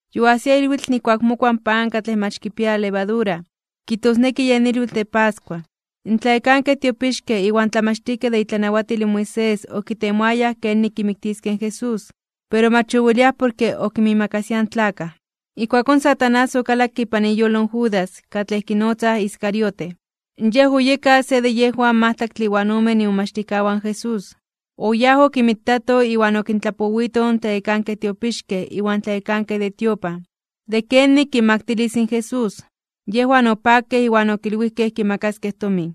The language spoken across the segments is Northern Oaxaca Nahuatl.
Yoajsia ilwitl nijkuak mokua in pan katlej mach kipia levadura, kijtosneki yen ilwitl de pascua. In tlayekankej tiopixkej iwan tlamachtijkej de itlanawatil in Moisés okitemoayaj kenik kimiktiskej in Jesús, pero mach oweliaj porke okinmiimakasiaj in tlakaj. Ijkuakón Satanás okalakke ipan iyolo in Judas, katlej kinotzaj Iscariote. Yej oyeka se de yejwan majtlaktle iwan omen imomachtijkawan in Jesús. Oyáj okinmitato iwan okintlapowito in tlayekankej tiopixkej iwan tlayekankej de tiopan, de kenik kinmaktilis in Jesús. Yejwan opakej iwan okilwijkej kimakaskej tomin.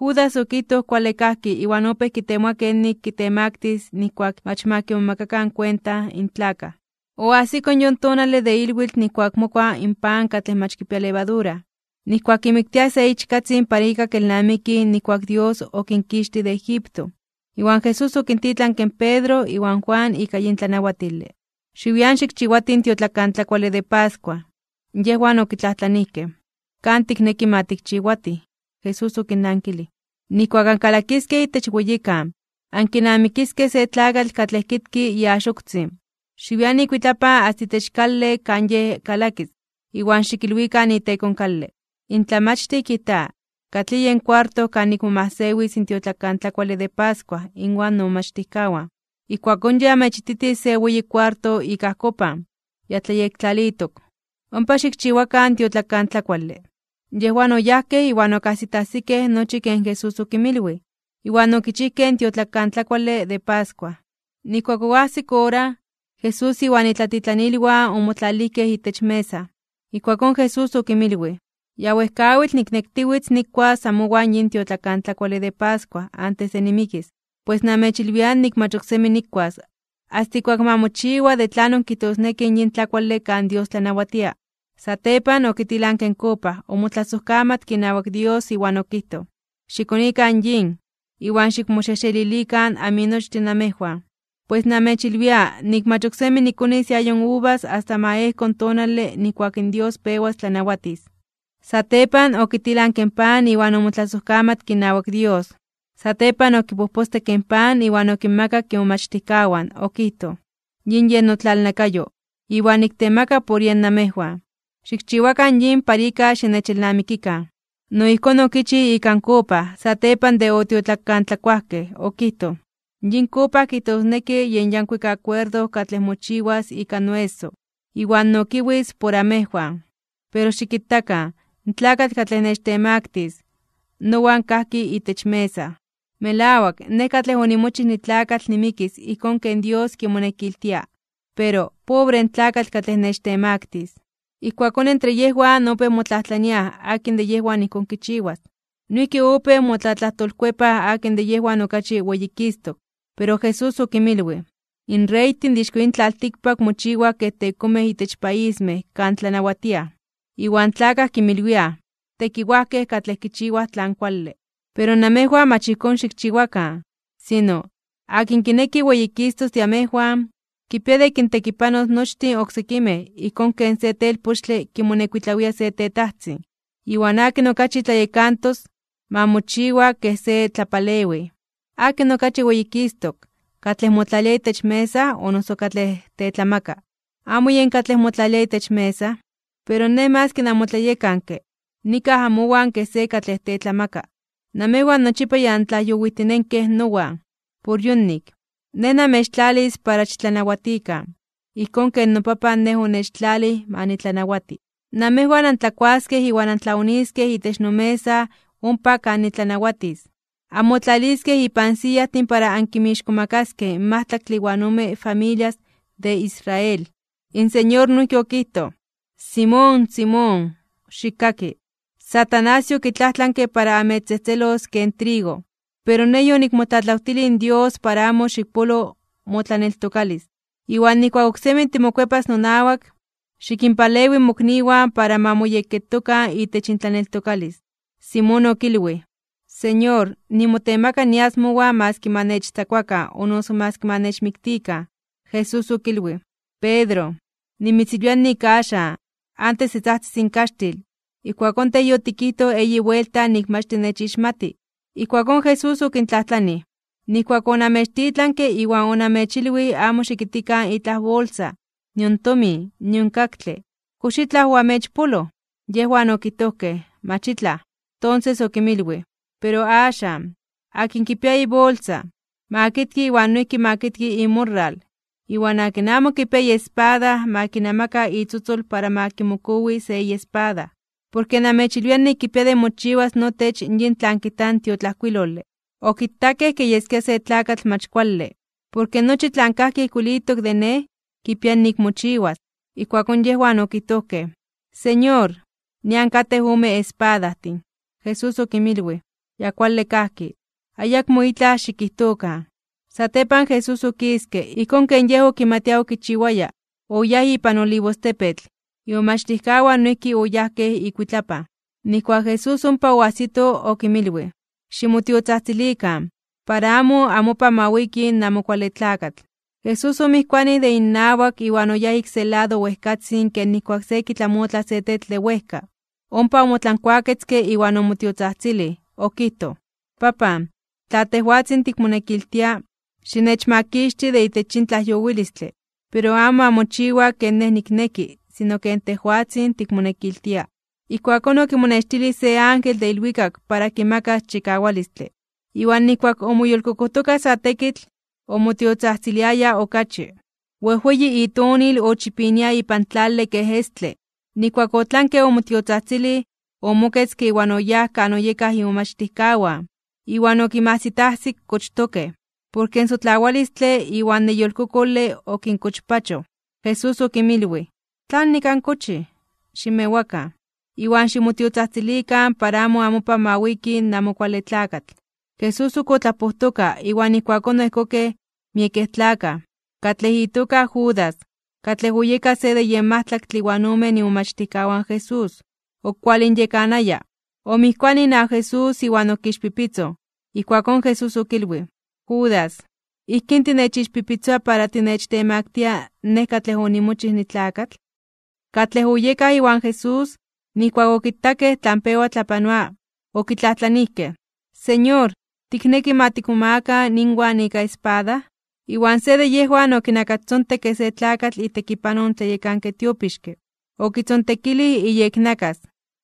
Judas okijtoj kuale kajki iwan opéj kitemoa kenik kitemaktis (kitemaktilis) nijkuak mach ma kimomakakan kuenta in tlakaj. Oajsiko yon tonale de ilwitl nijkuak mokua in pan katlej mach kipia levadura, nijkuak kimiktiaj se ichkatzin para ika kelnamikij nijkuak in Dios okinkixtij de Egipto. Iwan Jesús okintitlanke in Pedro iwan Juan ika yin tlanawatile: ―Xiwian xikchiwatij in tiotlakantlakuale de pascua. Yejwan okitlajtlanijkej: ―¿Kan tikneki ma tikchiwatij? Jesús okinnankilij: ―Nijkuak ankalakiskej itech weyikan, ankinamikiskej se tlakatl katlej kitki iaxoktzin. Xiwian ikuitlapan asta itech kale kan yej kalakis, iwan xikilwikan iteko in kale: “In Tlamachtij kijta: ¿Katlij yen kuarto kan nikmomajsewis in tiotlakantlakuale de pascua inwan nomomachtijkawan?” Ijkuakón yej amechititis se weyi kuarto ik ajkopan, ya tlayektlalitok. Ompa xikchiwakan in tiotlakantlakuale. Yejwan oyajkej iwan okajsitajsikej nochi ken Jesús okinmilwij, iwan okichijkej in tiotlakantlakuale de pascua. Nijkuak oajsik ora, Jesús iwan itlatitlanilwan omotlalijkej itech mesa. Ijkuakón Jesús okinmilwij: ―Ya wejkawitl niknektiwitz nikuas amowan yin tiotlakantlakuale de pascua antes de nimikis. Pues namechilwia nik mach ok semi nikuas, asta ijkuak ma mochiwa de tlanon kijtosneki in yin tlakuale kan Dios tlanawatia. Satepan okitilanke in kopa, omotlasojkamatke inawak Dios iwan okijtoj: ―Xikonikan yin, iwan xikmoxejxelilikan aminochtin namejwan. Pues namechilwia nik mach ok semi nikonis iayo uvas asta ma ejko in tonale nijkuak in Dios pewas tlanawatis. Satepan, okitilanke in pan iwan omotlasojkamatke inawak Dios. Satepan okipojpostekke in pan iwan okinmakak imomachtijkawan. Okijtoj: ―Yin yen notlalnakayo, iwan niktemaka por yen namejwan. Xikchiwakan yin para ika xinechelnamikikan. No ijkón okichij ika in kopa, satepan de otiotlakantlakuajkej, okijtoj: ―Yin kopa kijtosneki yen yankuik akuerdo katlej mochiwas ika noeso, iwan nokiwis por amejwan. ’Pero xikitakan, in tlakatl katlej nechtemaktis (nechtemaktilis), nowan kajki itech mesa. Melawak, Nej katlej onimochij nitlakatl nimikis ijkón ken Dios kimonekiltia. Pero ¡pobre in tlakatl katlej nechtemaktis! Ijkuakón entre yejwan opéj motlajtlaniaj akin de yejwan ijkón kichiwas. Noijki opéj motlatlajtolkuepaj akin de yejwan okachi weyikistok. Pero Jesús okinmilwij: ―In reytin de ixko yin tlaltikpak mochiwaj kej tekomej itech paismej kan tlanawatiaj. Iwan tlakaj kinmilwiaj “tekiwajkej katlej kichiwaj tlan kuale”. Pero namejwan mach ijkón xikchiwakan. Sino, akin kineki weyikistok de amejwan, kipia de kintekipanos nochtin oksekimej ijkón ken se telpochtle kimonekuitlawia se tetajtzin. Iwan akin okachi tlayekantos, ma mochiwa kej se tlapalewij. ¿Akin okachi weyikistok, katlej motlalia itech mesa o noso katlej tetlamaka? ¿Amo yen katlej motlalia itech mesa? Pero Nej maski namotlayekanke, nikaj amowan ken se katlej tetlamaka. ’Namejwan nochipa ya antlajyowijtinenkej nowan. Por yonik, Nej namechtlalis para xitlanawatikan, ijkón ken noPapan Nej onechtlalij ma nitlanawati. Namejwan antlakuaskej iwan antlaoniskej itech nomesa ompa kan nitlanawatis. Anmotlaliskej ipan siyajtin para ankimixkomakaskej in majtlaktle iwan ome familias de Israel. In Señor noijki okijtoj: ―Simón, Simón, xikkaki. Satanás yokitlajtlanke para amechtzejtzelos ken trigo. Pero Nej yonikmotlatlawtilij in Dios para amo xikpolo motlaneltokalis. Iwan nijkuak oksemi timokuepas nonawak, xikinpalewi mokniwan para ma moyekketokan itech intlaneltokalis. Simón okilwij: ―Señor, nimotemaka nias mowan maski ma nechtzakuakan o noso maski ma nechmiktikan. Jesús okilwij: ―Pedro, nimitzilwia nik axan, antes de tzajtzis in kaxtil, ijkuakón tej yotikijtoj eyi buelta nik mach tinechixmati. Ijkuakón Jesús okintlajtlanij: ―Nijkuak onamechtitlanke iwan onamechilwij amo xikitkikan itlaj bolsa, nion tomin, nion kaktle, ¿kox itlaj oamechpoloj? Yejwan okijtojkej: ―Mach itlaj. Tonses okinmilwij: ―Pero axan, akin kipia ibolsa, ma kitki iwan noijki ma kitki imorral. Iwan akin amo kipia iespada ma kinamaka itzotzol iwan ma kimokowi se iespada. Porke namechilwia nik kipia de mochiwas notech yin tlan kijta in tiotlajkuilole: “Okitakej kej yeskia se tlakatl mach kuale.” Porke nochi tlan kajki ijkuilitok de Nej, kipia nik mochiwas. Ijkuakón yejwan okijtojkej: ―Señor, nian katej ome espadajtin. Jesús okinmilwij: ―Ya kuale kajki, ayakmo itlaj xikijtokan. Satepan Jesús okiske. Ijkón ken Yej okimatia okichiwaya, oyáj ipan Olivostepetl. Imomachtijkawan noijki oyajkej ikuitlapan. Nijkuak Jesús ompa oajsito, okinmilwij: ―Ximotiotzajtzilikan, para amo amopan ma wiki in Amo Kuale Tlakatl. Jesús omijkuanij de innawak iwan oyáj ik se lado wejkatzin ken nijkuak se kitlamotla se tetl de wejka, ompa omotlankuaketzke iwan omotiotzajtzilij. Okijtoj: ―Papan, tla tejwatzin tikmonekiltia, xinechmakixti de itech yin tlajyowilistle. Pero amo ma mochiwa ken Nej nikneki, sino ken tejwatzin tikmonekiltia. Ijkuakón okimonextilij se ángel de ilwikak para kimakas chikawalistle. Iwan nijkuak omoyolkokojtoka sa tekitl, omotiotzajtziliaya okachi. Wejweyi itonil ochipinia ipan tlale kej estle. Nijkuak otlanke omotiotzajtzilij, omoketzke iwan oyáj kan oyekaj imomachtijkawan, iwan okinmajsitajsik kochtokej, porke in sotlawalistle iwan neyolkokole okinkochpachoj. Jesús okinmilwij: ―¿Tlanik ankochij? Ximewakan, iwan ximotiotzajtzilikan para amo amopan ma wiki in Amo Kuale Tlakatl. Jesús ok otlapojtoka, iwan ijkuakón oejkokej miekej tlakaj. Katlej itoka Judas, katlej oyeka se de yen majtlaktle iwan omen imomachtijkawan Jesús, okualinyekanaya. Omijkuanij inawak Jesús iwan okixpipitzoj. Ijkuakón Jesús okilwij: ―Judas, ¿ijkín tinechixpipitzoa para tinechtemaktia (techtemaktilia) Nej katlej onimochij nitlakatl? Katlej oyekaj iwan Jesús, nijkuak okitakej tlan pewa tlapanoa, okitlajtlanijkej: ―Señor, ¿tikneki ma tikmomagakan inwan ika espada? Iwan se de yejwan okinakastzontekke se tlakatl itekipanoj in tlayekanke tiopixke, okitzontekilij iyeknakas.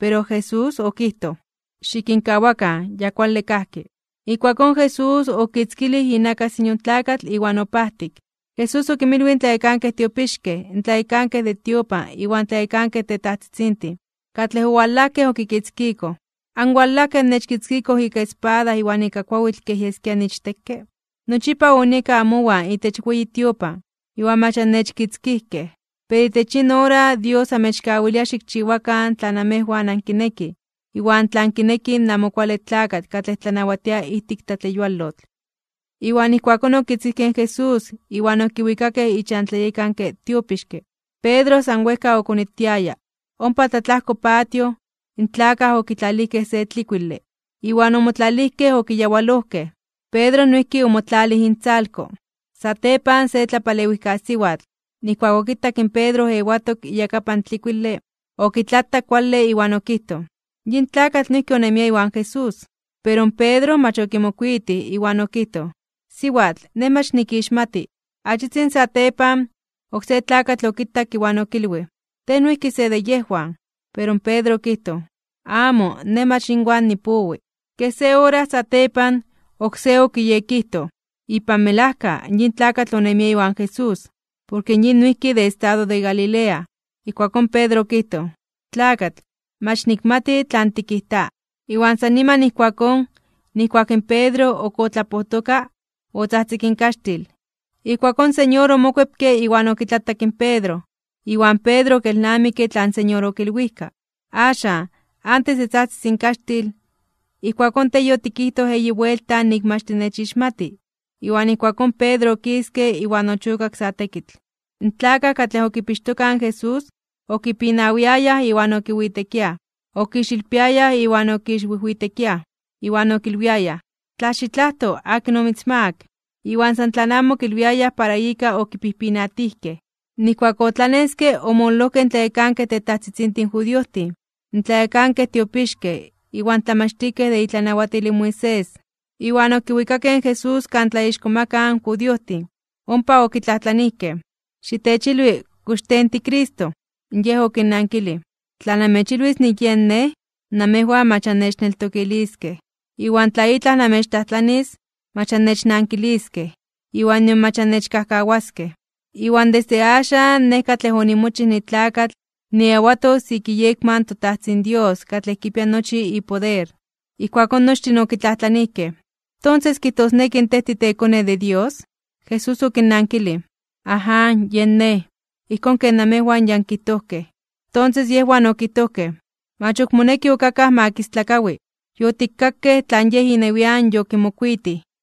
Pero Jesús okijtoj: ―Xikinkawakan. Ya kuale kajki. Ijkuakón Jesús okitzkilij inakas in yon tlakatl iwan opajtik. Jesús okinmilwij in tlayekankej tiopixkej, in tlayekankej de tiopan iwan tlayekankej tetajtzitzintin, katlej owalajkej okikitzkikoj: ―¿Anwalajkej annechkitzkikoj ika espada iwan ika kuawitl kej yeskia niichtekke? Nochipa onieka amowan itech weyi tiopan, iwan mach annechkitzkijkej. Pero itech yin ora Dios amechkawilia xikchiwakan tlan amejwan ankinekij, iwan tlan kineki in Amo Kuale Tlakatl katlej tlanawatia ijtik tlatleyualotl. Iwan ijkuakón okitzkijkej in Jesús, iwan okiwikakej ichan tlayekanke tiopixke. Pedro san wejka okonitiaya. Ompa tlatlajko patio, in tlakaj okitlalijkej se tlikuile, iwan omotlalijkej okiyawalojkej. Pedro noijki omotlalij intzalko. Satepan se tlapalewijkasiwatl, nijkuak okitak in Pedro ewatok iyakapan tlikuile, okitlatak kuale iwan okijtoj: ―Yin tlakatl noijki onemia iwan Jesús. Pero in Pedro mach okimokuitij, iwan okijtoj: ―Siwatl, nej mach nikixmati. Achitzin satepan, oksé tlakatl okitak iwan okilwij: ―Tej noijki se de yejwan. Pero in Pedro okijtoj: ―Amo, nej mach inwan nipowi. Kej se ora satepan, oksé okiyekijtoj: ―Ipan melajka, yin tlakatl onemia iwan Jesús, porke yin noijki de estado de Galilea. Ijkuakón Pedro okijtoj: ―Tlakatl, mach nikmati tlan tikijta. Iwan san niman ijkuakón, nijkuak in Pedro ok otlapojtoka, otzajtzik in kaxtil. Ijkuakón in Señor omokuepke iwan okitlatak in Pedro, iwan Pedro okelnamikke tlan Señor okilwijka: “Axan, antes de tzajtzis in kaxtil, ijkuakón tej yotikijtoj eyi buelta nik mach tinechixmati.” Iwan ijkuakón Pedro okiske iwan ochokak sa tekitl. In tlakaj katlej okipixtokaj in Jesús, okipinawiayaj iwan okiwitekiaj. Okixilpiayaj iwan okixwijwitekiaj, iwan okilwiayaj: ―¡Tla xitlajto (xikadibinaro), akin omitzmaak! Iwan san tlan amo okilwiayaj para ika okipijpinatijkej. Nijkuak otlaneske, omololojkej in tlayekankej tetajtzitzintin judiojtin, in tlayekankej tiopixkej, iwan tlamachtijkej de itlanawatil in Moisés, iwan okiwikakej in Jesús kan tlaixkomakaj (tlatzonmanaj) in judiojtin. Ompa okitlajtlanijkej: ―Xitechilwi, ¿kox tej in tiCristo? Yej okinnankilij: ―Tla namechilwis nik yen Nej, namejwan mach annechneltokiliskej. Iwan tla itlaj namechtlajtlanis, mach annechnankiliskej, iwan nion mach annechkajkawaskej. Iwan desde axan Nej katlej onimochij nitlakatl niewatos ik iyekma in toTajtzin Dios katlej kipia nochi poder. Ijkuakón nochtin okitlajtlanijkej: ―¿Tonses kijtosneki tej titeKone de Dios? Jesús okinnankilij: ―Aján, yen Nej. Ijkón ken namejwan ya ankijtojkej. Tonses yejwan okijtojkej: ―Mach ok moneki ok akaj ma kistlakawi. Yotikkakej tlan Yej inewian yokimokuitij.